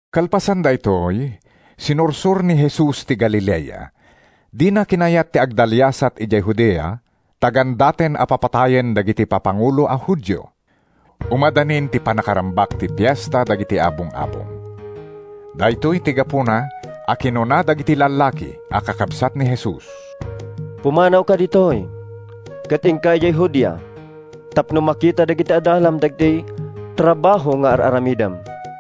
Kalpasan daytoy, sinursor ni Jesus ti Galilea. Dina kinayat ti agdaliasat idiay Judea, ta gandaten a papatayen dagiti papangulo a Judio. Umadanin ti pannakarambak ti Fiesta dagiti Abong-abong. Daytoy ti gapuna a kinuna dagiti lallaki a kakabsat ni Jesus, “Pumanawka ditoy ket inka idiay Judea, tapno makita dagiti adalam dagiti trabaho nga ar-aramidem.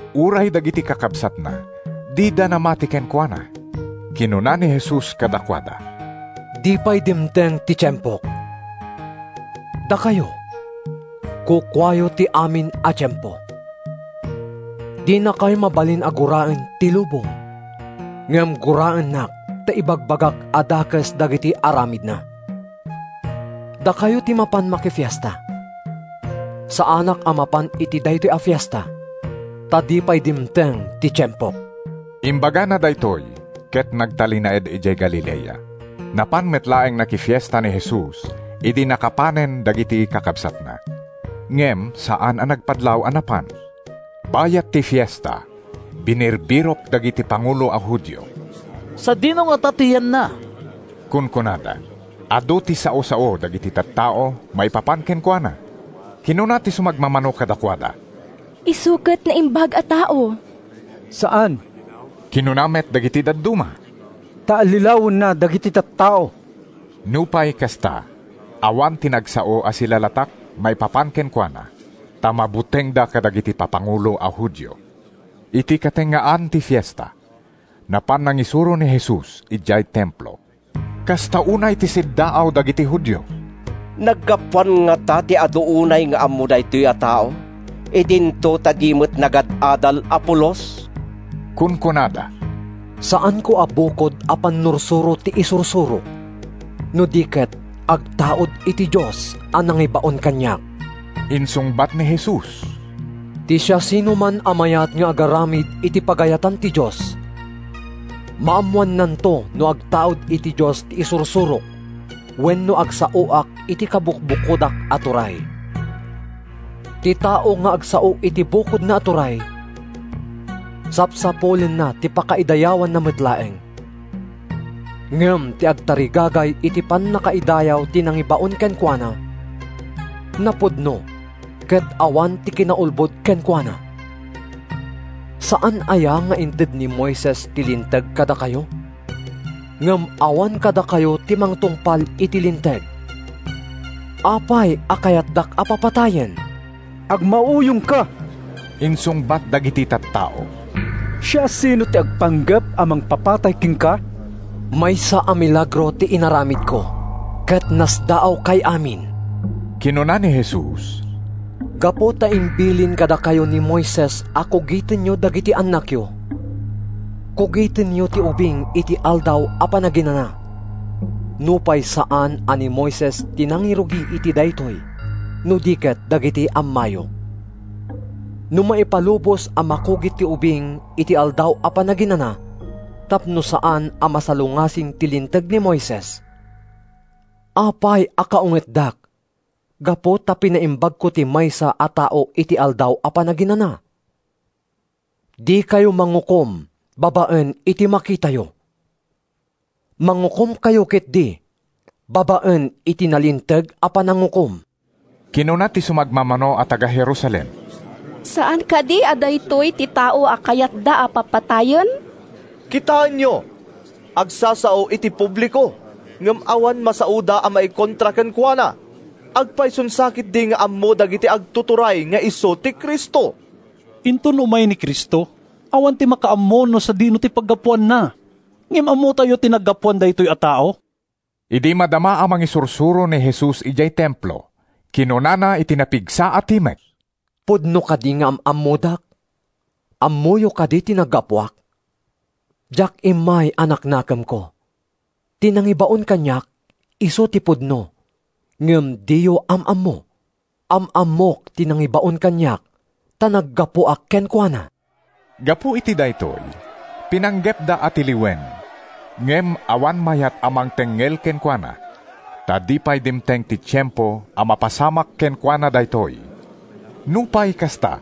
Uray dagiti kakabsatna dida namati kenkuana.) Kinuna ni Jesus kadakuada, “Di pay dimteng ti tiempok. Dakayo, kukuayo ti amin a tiempo. Dinakay mabalin a guraen ti lubong, ngem guraennak ta ibagbagak a dakes dagiti aramidna. Dakayo ti mapan makifiesta. Saanak a mapan iti daytoy a fiesta, ta di pay dimteng ti tiempok.” Imbagana daytoy ket nagtalinaed idiay Galilea. Napan met laeng nakifiesta ni Jesus idi nakapanen dagiti kakabsatna. Ngem saan a nagpadlaw a napan. Bayat ti fiesta, binirbirok dagiti pangulo a Judio. “Sadino ngata ti yanna?” kunkunada. Adu ti sao-sao dagiti tattao maipapan kenkuana. Kinuna ti sumagmamano kadakuada, “Isu ket naimbag a tao.” “Saan,” kinuna met dagiti dadduma, “ta allilawenna dagiti tattao.” Nupay kasta, awan ti nagsao a silalatak maipapan kenkuana ta mabutengda kadagiti papangulo a Judio. Iti katengngaan ti fiesta, napan nangisuro ni Jesus idiay Templo. Kasta unay ti siddaaw dagiti Judio. “Naggapuan ngata ti adu unay nga ammo daytoy a tao, idinto ta di met nagad-adal a pulos?” kunkunada. “Saanko a bukod a pannursuro ti isursurok, no di ket agtaud iti Dios a nangibaon kaniak,” insungbat ni Jesus. “Ti siasinoman a mayat nga agaramid iti pagayatan ti Dios, maammoannanto no agtaud iti Dios ti isursurok wenno agsaoak iti kabukbukodak a turay. Ti tao nga agsao iti bukodna a turay, sapsapulenna ti pakaidayawanna met laeng. Ngem ti agtarigagay iti pannakaidayaw ti nangibaon kenkuana, napudno ket awan ti kinaulbod kenkuana. Saan aya nga inted ni Moises ti Linteg kadakayo? Ngem awan kadakayo ti mangtungpal iti Linteg. Apay a kayatdak a papatayen?” “Agmauyongka!” insungbat dagiti tattao. “Siasino ti agpanggep a mangpapatay kenka?” “Maysa a milagro ti inaramidko ket nasdaawkay amin,” kinuna ni Jesus. “Gapu ta imbilin kadakayo ni Moises a kugitenyo dagiti annakyo, kugitenyo ti ubing iti Aldaw a Panaginana (nupay saan a ni Moises ti nangirugi iti daytoy no di ket dagiti ammayo). No maipalubos a makugit ti ubing iti Aldaw a Panaginana tapno saan a masalungasing ti Linteg ni Moises, apay a kaungetdak gapu ta pinaimbagko ti maysa a tao iti Aldaw a Panaginana? Dikayo mangukom babaen iti makitayo. Mangukomkayo ketdi babaen iti nalinteg a panangukom.” Kinuna ti sumagmamano a taga-Jerusalem, “Saan kadi a daytoy ti tao a kayatda a papatayen? Kitaenyo! Agsasao iti publiko, ngem awan masaoda a maikontra kenkuana. Agpayson sa ketdi nga ammo dagiti agtuturay nga isu ti Cristo? Inton umay ti Cristo, awan ti makaammo no sadino ti paggapuanna. Ngem ammotayo ti naggapuan daytoy a tao.” Idi madama a mangisursuro ni Jesus idiay Templo, kinunana iti napigsa a timek, “Pudno kadi nga am-ammodak? Ammoyo kadi ti naggapuak? Diak immay a naknakemko. Ti nangibaon kaniak isu ti pudno, ngem diyo am-ammo. Am-ammok ti nangibaon kaniak ta naggapuak kenkuana.” Gapu iti daytoy, pinanggepda a tiliwen, ngem awan mayat a mangtengngel kenkuana, ta di pay dimteng ti tiempo a mapasamak kenkuana daytoy. Nupay kasta,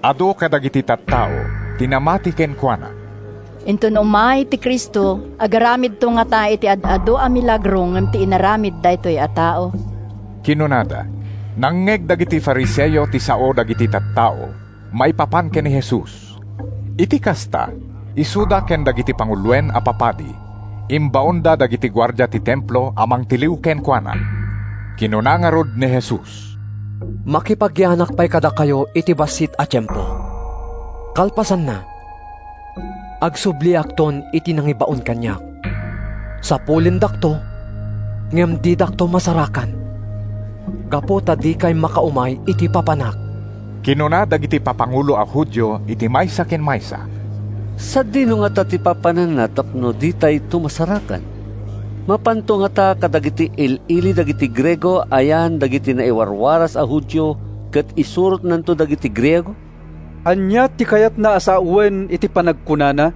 adu kadagiti tattao ti namati kenkuana. “Inton umay ti Cristo, agaramidto ngata iti ad-adu a milagro ngem ti inaramid daytoy a tao?” kinunada. Nangngeg dagiti Fariseo ti sao dagiti tattao maipapan ken ni Jesus. Iti kasta, isuda ken dagiti panguloen a papadi imbaonda dagiti guardia ti Templo a mangtiliw kenkuana. Kinuna ngarud ni Jesus, “Makipagyanak pay kadakayo iti bassit a tiempo. Kalpasanna, agsubliakton iti nangibaon kaniak. Sapulendakto ngem didakto masarakan, gapu ta dikay makaumay iti papanak.” Kinuna dagiti papangulo a Judio iti maysa ken maysa, “Sadino ngata ti papananna tapno ditayto masarakan? Mapanto ngata kadagiti il-ili dagiti Griego a yan dagiti naiwaraswaras a Judio ket isuronanto dagiti Griego? Ania ti kayatna a sawen iti panagkunana,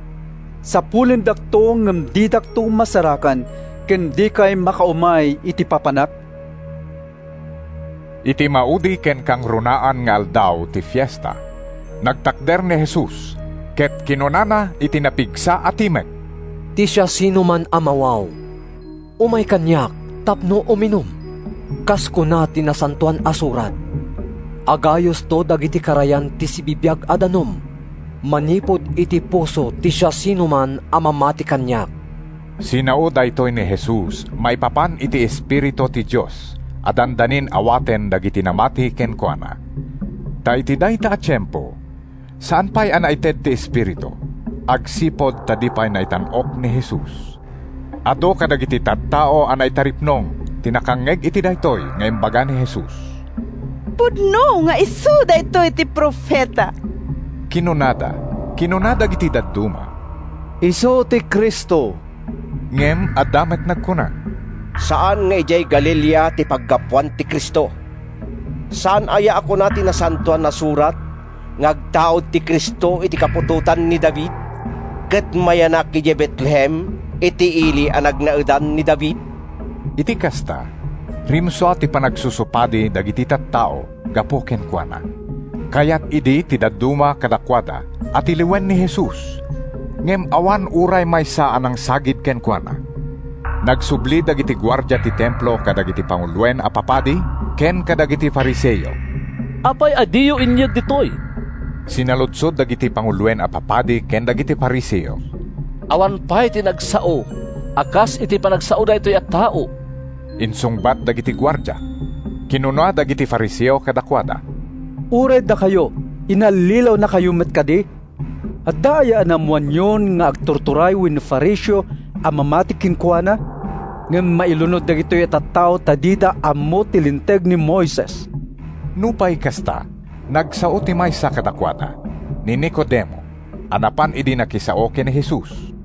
‘Sapulendakto ngem didakto masarakan,’ ken ‘Dikay makaumay iti papanak?’” Iti maudi ken kangrunaan nga aldaw ti fiesta, nagtakder ni Jesus ket kinunana iti napigsa a timek, “Ti siasinoman a mawaw, umay kaniak tapno uminum. Kas kuna ti Nasantoan a Surat, ‘Agayusto dagiti karayan ti sibibiag a danum manipud iti puso ti siasinoman a mamati kaniak.’” (Sinao daytoy ni Jesus maipapan iti Espiritu ti Dios a dandanin awaten dagiti namati kenkuana. Ta iti dayta a tiempo, saan pay a naited ti Espiritu, agsipud ta di pay naitan-ok ni Jesus.) Adu kadagiti tattao a naitaripnong ti nakangngeg iti daytoy nga imbaga ni Jesus. “Pudno nga isu daytoy ti profeta!” kinunada. Kinuna dagiti dadduma, “Isu ti Cristo!” Ngem adda met nagkuna, “Saan nga idiay Galilea ti paggapuan ti Cristo! Saan aya a kuna ti Nasantoan a Surat nga agtaud ti Cristo iti kaputotan ni David, ket mayanak idiay Betlehem, iti ili a nagnaedan ni David?” Iti kasta, rimsua ti panagsusupadi dagiti tattao gapu kenkuana. Kayat idi ti dadduma kadakuada a tiliwen ni Jesus, ngem awan uray maysa a nangsagid kenkuana. Nagsubli dagiti guardia ti Templo kadagiti panguloen a papadi ken kadagiti Fariseo. “Apay a diyo inyeg ditoy?” sinaludsod dagiti panguloen a papadi ken dagiti Fariseo. “Awan pay ti nagsao a kas iti panagsao daytoy a tao!” insungbat dagiti guardia. Kinuna dagiti Fariseo kadakuada, “Uray dakayo, inallilawnakayo met kadi? Adda aya naammoanyon nga agtuturay wenno Fariseo a mamati kenkuana? Ngem mailunod dagitoy a tattao ta dida ammo ti Linteg ni Moises.” Nupay kasta, nagsao ti maysa kadakuada, ni Nicodemo, a napan idi nakisao ken ni Jesus.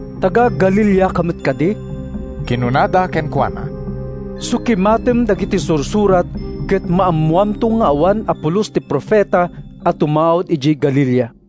“Taga-Galileaka met kadi?” kinunada kenkuana. “Sukimatem dagiti Sursurat ket maammoamto nga awan a pulos ti profeta a tumaud idiay Galilea.”